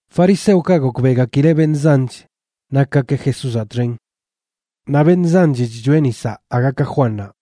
Fariseokaꞌ gokbeꞌgakileꞌ beṉꞌ zanch nakgakeꞌ Jesúzaꞌ txen, naꞌ beṉꞌ zanch chchoeꞌ nisaꞌ aga ka Juannaꞌ,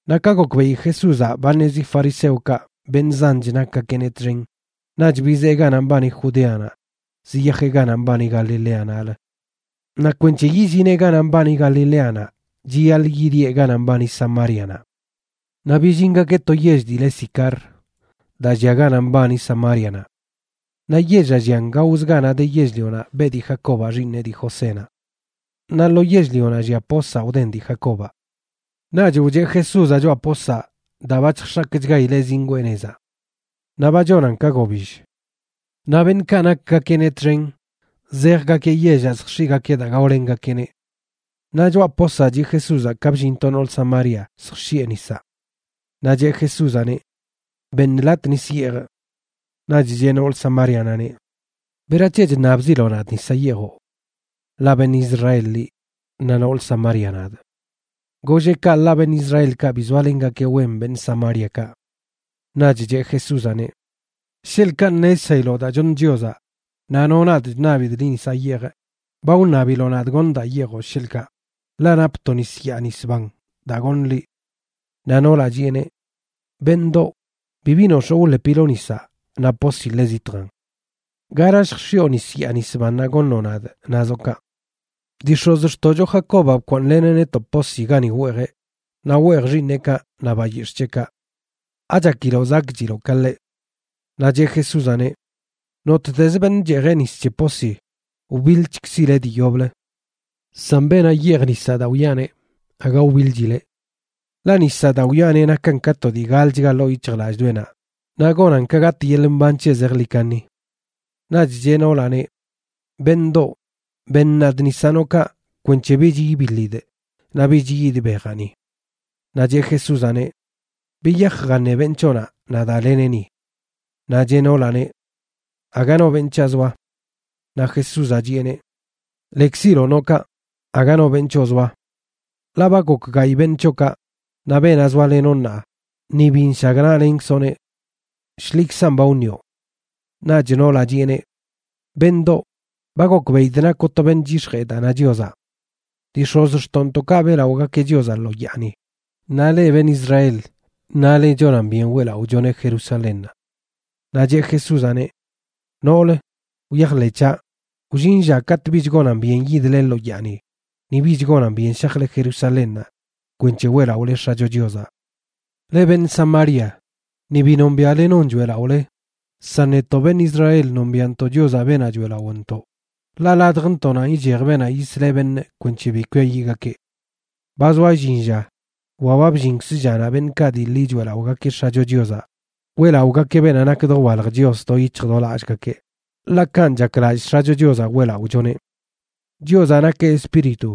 Naꞌ ka gokbeꞌi Jesúzaꞌ ba ṉezi fariseokaꞌ beṉꞌ zanch nakgakeꞌneꞌ txen, naꞌch bizee ganaꞌ mbani Judeanaꞌ ziyajeꞌ ganaꞌ mbani Galiléanaꞌlə. Naꞌ kwenc̱he yillineꞌ ganaꞌ mbani Galileanaꞌ chiyaḻꞌ yidieꞌ ganaꞌ mbani Samárianaꞌ. Naꞌ billingakeꞌ to yell dii le Sicar, daa llia ganaꞌ mbani Samárianaꞌ. Naꞌ yellaꞌ llian gaozə ganaꞌ de yell-lionaꞌ beꞌ dii Jacobaꞌ xiiṉeꞌ dii Josénaꞌ. Naꞌ lo yell-lionaꞌ llia posaꞌ wden dii Jacobaꞌ. Naꞌch wcheꞌ Jesúzaꞌ choꞌa posaꞌ daa ba chjx̱akchgaileꞌ zingwee nezaꞌ. Naꞌ ba chonan ka gobill. Naꞌ beṉꞌkaꞌ nakgakeꞌneꞌ txen zejgakeꞌ yellaꞌ zjx̱iꞌgakeꞌ daa gaolengakeꞌneꞌ. Naꞌ choꞌa posaꞌ chiꞌ Jesúzaꞌ ka bllin to noolə Samaria zjx̱iꞌe nisaꞌ. Naꞌ cheꞌ Jesúzaꞌneꞌ: ―Beṉ latꞌ nis yeejꞌ. Naꞌch cheꞌ noolə Samárianaꞌneꞌ: ―¿Berac̱he chṉabziloꞌ nadꞌ nisaꞌ yeejoꞌ?, ḻaꞌ beṉꞌ Israel liꞌ, naꞌ nool Samaria nadꞌ. Golleꞌ kaꞌ ḻaꞌ beṉꞌ Israelkaꞌ bi zoalengakeꞌ wen beṉꞌ Samáriakaꞌ. Naꞌch cheꞌ Jesúzaꞌneꞌ: ―Sheḻꞌkaꞌ ṉezshailoꞌ daa choṉ Chiozaꞌ naꞌ no nadꞌ chṉabidꞌ liꞌ nisaꞌ yeejꞌ, ba wṉabiloꞌ nadꞌ goṉ daa yeejoꞌ, sheḻꞌkaꞌ, ḻaꞌ napꞌ to nis yaa nis ban daa goṉ liꞌ. Naꞌ noolaꞌ chiꞌeneꞌ: ―Beṉꞌdoꞌ, bibi nox̱oo wḻepiloꞌ nisaꞌ, naꞌ posi ḻe zitjan. ¿Gara lljx̱iꞌo nis yaa nis bannaꞌ goṉoꞌ nadꞌ nazoꞌ kaꞌ? Dii x̱ozxtoꞌcho Jacobaꞌ bkwaaṉleneꞌ netoꞌ posi gani weejeꞌ, naꞌ weej xiiṉeꞌkaꞌ naꞌ bayix̱ꞌ c̱heꞌkaꞌ. ¿Achakiloꞌ zakꞌchiloꞌ ka ḻeꞌ? Naꞌ cheꞌ Jesúzaꞌneꞌ: ―Nottezə beṉꞌ cheejeꞌ nis c̱he posi, wbiḻchkzileꞌ dii yoblə. San beenaꞌ yeej nisaꞌ daa wiꞌaneꞌ, aga wbiḻchileꞌ. Ḻaꞌ nisaꞌ daa wiꞌaneꞌ nakan ka to dii galchga ḻoo yic̱hjlallꞌdoꞌenaꞌ naꞌ gonan ka gatꞌ yeḻꞌ mban c̱heꞌ zejḻi kaṉi. Naꞌch cheꞌ noolaꞌneꞌ: ―Beṉꞌdoꞌ, beṉ nadꞌ nisaꞌ noꞌ kaꞌ kwenc̱he bich ibiḻidꞌ naꞌ bich yid bejaꞌ ni. Naꞌ cheꞌ Jesúzaꞌneꞌ: ―Biyaj jaṉe beṉꞌ c̱hoꞌnaꞌ, naꞌ daleneꞌ ni. Naꞌ cheꞌ noolaꞌneꞌ: ―Aga no beṉꞌ c̱haꞌ zoa. Naꞌ Jesúzaꞌ chiꞌeneꞌ: ―Lekziloꞌ noꞌ kaꞌ, aga no beṉꞌ c̱hoꞌ zoa. Ḻaꞌ ba gok gayꞌ beṉꞌ c̱hoꞌkaꞌ, naꞌ beenaꞌ zoalenoꞌ ṉaa ni bi nshagnaꞌlenkzoꞌneꞌ. Shḻikzan ba wṉioꞌ. Naꞌch noolaꞌ chiꞌeneꞌ: ―Beṉꞌdoꞌ, ba gokbeꞌidꞌ nakoꞌ to beṉꞌ chyix̱jee daa na Chiozaꞌ. Dii x̱ozxtoꞌntoꞌkaꞌ beꞌlaꞌogakeꞌ Chiozaꞌ lo yaani, naꞌ leꞌ beṉꞌ Israel nale chonan byen weꞌlaꞌochoneꞌ Jerusalénnaꞌ. Naꞌ cheꞌ Jesúzaꞌneꞌ: ―Noolə, wyajḻeꞌ c̱haꞌ, wllin lla katꞌ bich gonan byen yidle lo yaani, ni bich gonan byen shajle Jerusalénnaꞌ kwenc̱he weꞌlaꞌole X̱acho Chiozaꞌ. Leꞌ beṉꞌ Samaria ni bi nombiaꞌle non choeꞌlaꞌole, san netoꞌ beṉꞌ Israel nombiaꞌntoꞌ Chiozaꞌ, beenaꞌ choeꞌlaꞌontoꞌ, ḻaꞌ ladjntoꞌnanꞌ ichej beenaꞌ yisleꞌ beṉꞌ kwenc̱he bi kwiayiꞌgakeꞌ. Ba zoa illin lla, wa ba bllinkz llanaꞌ beṉꞌkaꞌ dii ḻi choeꞌlaꞌogakeꞌ X̱acho Chiozaꞌ weꞌlaꞌogakeꞌ beenaꞌ nak dowalj Chios do yic̱hj do lallgakeꞌ, ḻaꞌ kanꞌ chaklallꞌ X̱acho Chiozaꞌ weꞌlaꞌochoneꞌ. Chiozaꞌ nakeꞌ Espíritu,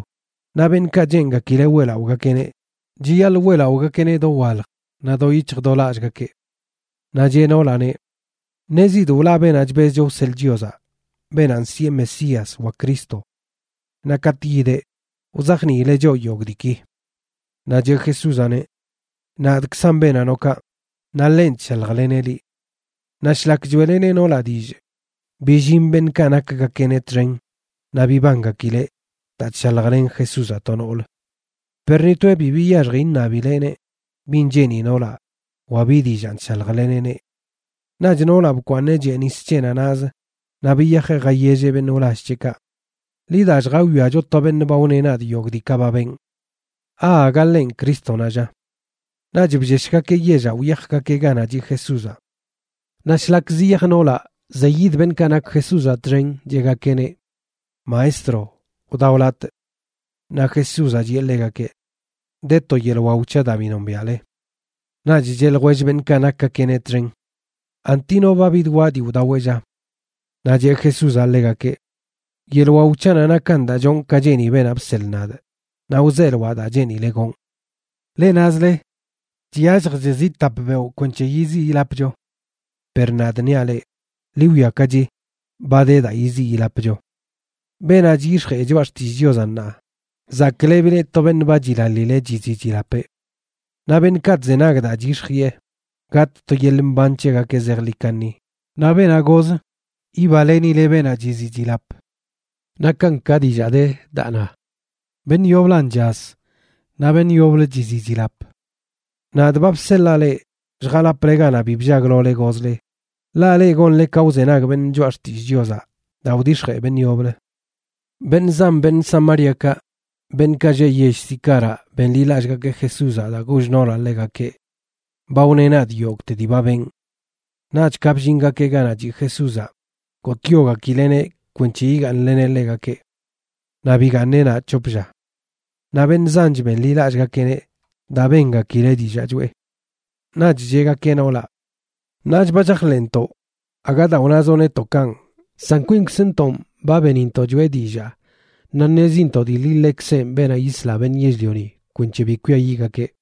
naꞌ beṉꞌkaꞌ cheengakileꞌ weꞌlaꞌogakeꞌneꞌ, chiyaḻꞌ weꞌlaꞌogakeꞌneꞌ dowalj naꞌ do yic̱hj do lallꞌgakeꞌ. Naꞌ cheꞌ noolaꞌneꞌ: ―Ṉezidꞌ wlaꞌ beenaꞌ chbezcho wseḻꞌ Chiozaꞌ beenaꞌ nsiꞌe Mesías wa Cristo. Naꞌ katꞌ yideꞌ, wzajniileꞌ choꞌ yogꞌ diiki. Naꞌ cheꞌ Jesúzaꞌneꞌ: ―Nadꞌkzanꞌ beenaꞌ noꞌ kaꞌ, naꞌ ḻenꞌ chshaljleneꞌ liꞌ. Naꞌ shlak choeꞌleneꞌ noolaꞌ dillꞌ, billin beṉꞌkaꞌ nakgakeꞌneꞌ txen naꞌ bibangakileꞌ daa chshaljlen Jesúzaꞌ to noolə. Per ni toeꞌ bi biyaxji iṉabileꞌneꞌ bin cheeni noolaꞌ wa bi dillaan chshaljleneꞌneꞌ. Naꞌch noolaꞌ bkwaaṉeꞌ chee nis c̱heꞌnaꞌ naꞌzə, naꞌ biyajeꞌ jayelleꞌ beṉꞌ wlall c̱heꞌkaꞌ: ―Ḻi da lljawiacho to beṉꞌ ba wneꞌ nadꞌ yogꞌ diikaꞌ ba benꞌ. ¿Aaga ḻenꞌ Crístonaꞌ, lla? Naꞌch blleshgakeꞌ yellaꞌ wyajgakeꞌ ganaꞌ chiꞌ Jesúzaꞌ. Naꞌ shlak ziyaj noolaꞌ zeyid beṉꞌkaꞌ nak Jesúzaꞌ txen cheꞌgakeꞌneꞌ: ―Maestro, wdao latꞌ. Naꞌ Jesúzaꞌ chiꞌe ḻegakeꞌ: ―De to yeḻꞌ wao c̱haꞌ daa bi nombiaꞌle. Naꞌch cheꞌ ljwell beṉꞌkaꞌ nakgakeꞌneꞌ txen: ―¿Anti no ba bidwaꞌ dii wdaweꞌ, lla? Naꞌ cheꞌ Jesúzaꞌ ḻegakeꞌ: ―Yeḻꞌ wao c̱haꞌnaꞌ nakan daa chonꞌ ka cheeni beenaꞌ bseḻꞌ nadꞌ naꞌ wzeeloaꞌ daa cheenileꞌ gonꞌ. Leꞌ nazle: “Chyalljch zi tap beoꞌ kwenc̱he yiziꞌ yilapcho.” Per nadꞌ niaꞌ leꞌ, ḻi wwiakachi ba de daa yiziꞌ yilapcho. Beenaꞌ chyix̱jee choꞌa xtillꞌ Chiozaꞌ ṉaa, zaklebileꞌ to beṉꞌ ba chilaḻileꞌ chiziꞌ chilapeꞌ. Naꞌ beṉꞌkaꞌ chzenag daa chyix̱jiꞌe, gatꞌ to yeḻꞌ mban c̱hegakeꞌ zejḻi kaṉi, naꞌ beenaꞌ goz yibalenileꞌ beenaꞌ chiziꞌ chilap. Nakan ka dillaa de daa na: “Beṉꞌ yoblan chaz naꞌ beṉꞌ yoblə chiziꞌ chilap.” Nadꞌ ba bseḻaa leꞌ lljalaple ganaꞌ bi bllaglole gozle, ḻaꞌ leꞌ gonle ka wzenag beṉꞌ choꞌa xtillꞌ Chiozaꞌ daa wdix̱jee beṉꞌ yoblə. Beṉꞌ zan beṉꞌ Samáriakaꞌ, beṉꞌkaꞌ lleꞌ yell Sicaraꞌ benḻilallꞌgakeꞌ Jesúzaꞌ daa goll noolaꞌ ḻegakeꞌ: “Ba wneꞌ nadꞌ yogꞌte dii ba benꞌ.” Naꞌch ka bllingakeꞌ ganaꞌ chiꞌ Jesúzaꞌ, gotꞌyogakileꞌneꞌ kwenc̱he yigaaṉleneꞌ ḻegakeꞌ. Naꞌ bigaaṉeꞌ naꞌ c̱hop lla. Naꞌ beṉꞌ zanch benḻilallꞌgakeꞌneꞌ daa bengakileꞌ dillaa choꞌe. Naꞌch cheꞌgakeꞌ noolaꞌ: ―Ṉaach ba chajḻeꞌntoꞌ, aga daa wnazoꞌ netoꞌ kanꞌ, san kwinkzntonꞌ ba benintoꞌ choꞌe dillaa naꞌ ṉezintoꞌ dii ḻi ḻekzenꞌ beenaꞌ yisla beṉꞌ yell-lioni kwenc̱he bi kwiayiꞌgakeꞌ.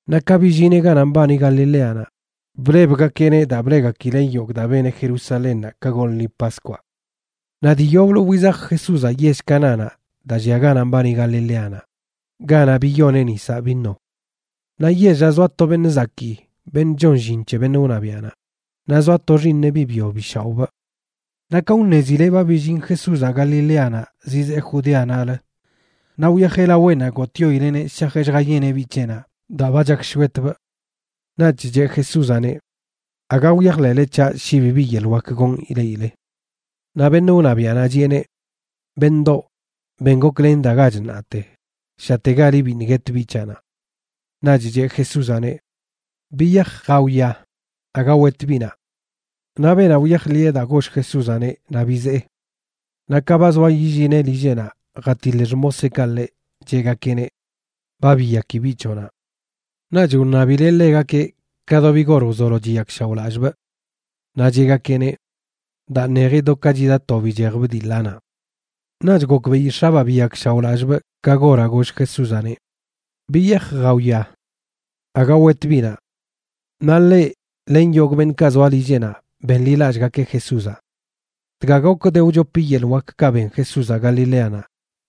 Naꞌ ka billineꞌ ganaꞌ mbani Galileanaꞌ, blebgakeꞌneꞌ daa bleꞌgakileꞌ yogꞌ daa beneꞌ Jerusalénnaꞌ ka goḻꞌ lṉi Paskwaꞌ. Naꞌ dii yoblə wizaj Jesúzaꞌ yell Canánaꞌ daa llia ganaꞌ mbani Galileanaꞌ, ganaꞌ biyoneꞌ nisaꞌ vino. Naꞌ yellaꞌ zoa to beṉꞌ zakii beṉꞌ chon llin c̱he beṉꞌ wṉabiaꞌnaꞌ, naꞌ zoa to xiiṉeꞌ biꞌ byo bi shaoꞌbꞌ. Naꞌ ka wṉezileꞌ ba billin Jesúzaꞌ Galileanaꞌ zizee Judeanaꞌlə, naꞌ wyajeꞌ laweꞌnaꞌ gotꞌyoileꞌneꞌ shajeꞌ lljayeneꞌ biꞌ c̱heꞌnaꞌ daa ba chakshwetbꞌ. Naꞌch cheꞌ Jesúzaꞌneꞌ: ―Aga wyajḻeꞌle c̱haꞌ shi bibi yeḻꞌ wak gonꞌ ileꞌile. Naꞌ beṉꞌ wṉabiaꞌnaꞌ chiꞌeneꞌ: ―Beṉꞌdoꞌ, ben goklen dagach ṉaate, shategali biṉꞌ guet biꞌ c̱haꞌnaꞌ. Naꞌch cheꞌ Jesúzaꞌneꞌ: ―Biyaj, jawia. Aga wet biꞌnaꞌ. Naꞌ beenaꞌ wyajḻiꞌe daa goll Jesúzaꞌneꞌ naꞌ bizee. Naꞌ ka ba zoa yillineꞌ lilleꞌnaꞌ jatiḻ xmoseꞌkaꞌ ḻeꞌ, cheꞌgakeꞌneꞌ: ―Ba biyaki biꞌ c̱hoꞌnaꞌ. Naꞌch wṉabileꞌ ḻegakeꞌ ka do bi gor wzolo chiyakshaoꞌlallꞌbꞌ. Naꞌ cheꞌgakeꞌneꞌ: ―Daa ṉeji do ka chida to bichejbꞌ dii ḻanaꞌ. Naꞌch gokbeꞌi x̱abaa biyakshaoꞌlallꞌbꞌ ka goraꞌ goll Jesúzaꞌneꞌ: “Biyaj jawia. Aga wet biꞌnaꞌ.” Naꞌ ḻeꞌ len yogꞌ beṉꞌkaꞌ zoa lilleꞌnaꞌ benḻilallꞌgakeꞌ Jesúzaꞌ. Dga gok de wchopi yeḻꞌ wakkaꞌ ben Jesúzaꞌ Galileanaꞌ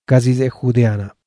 ka zizee Judeanaꞌ.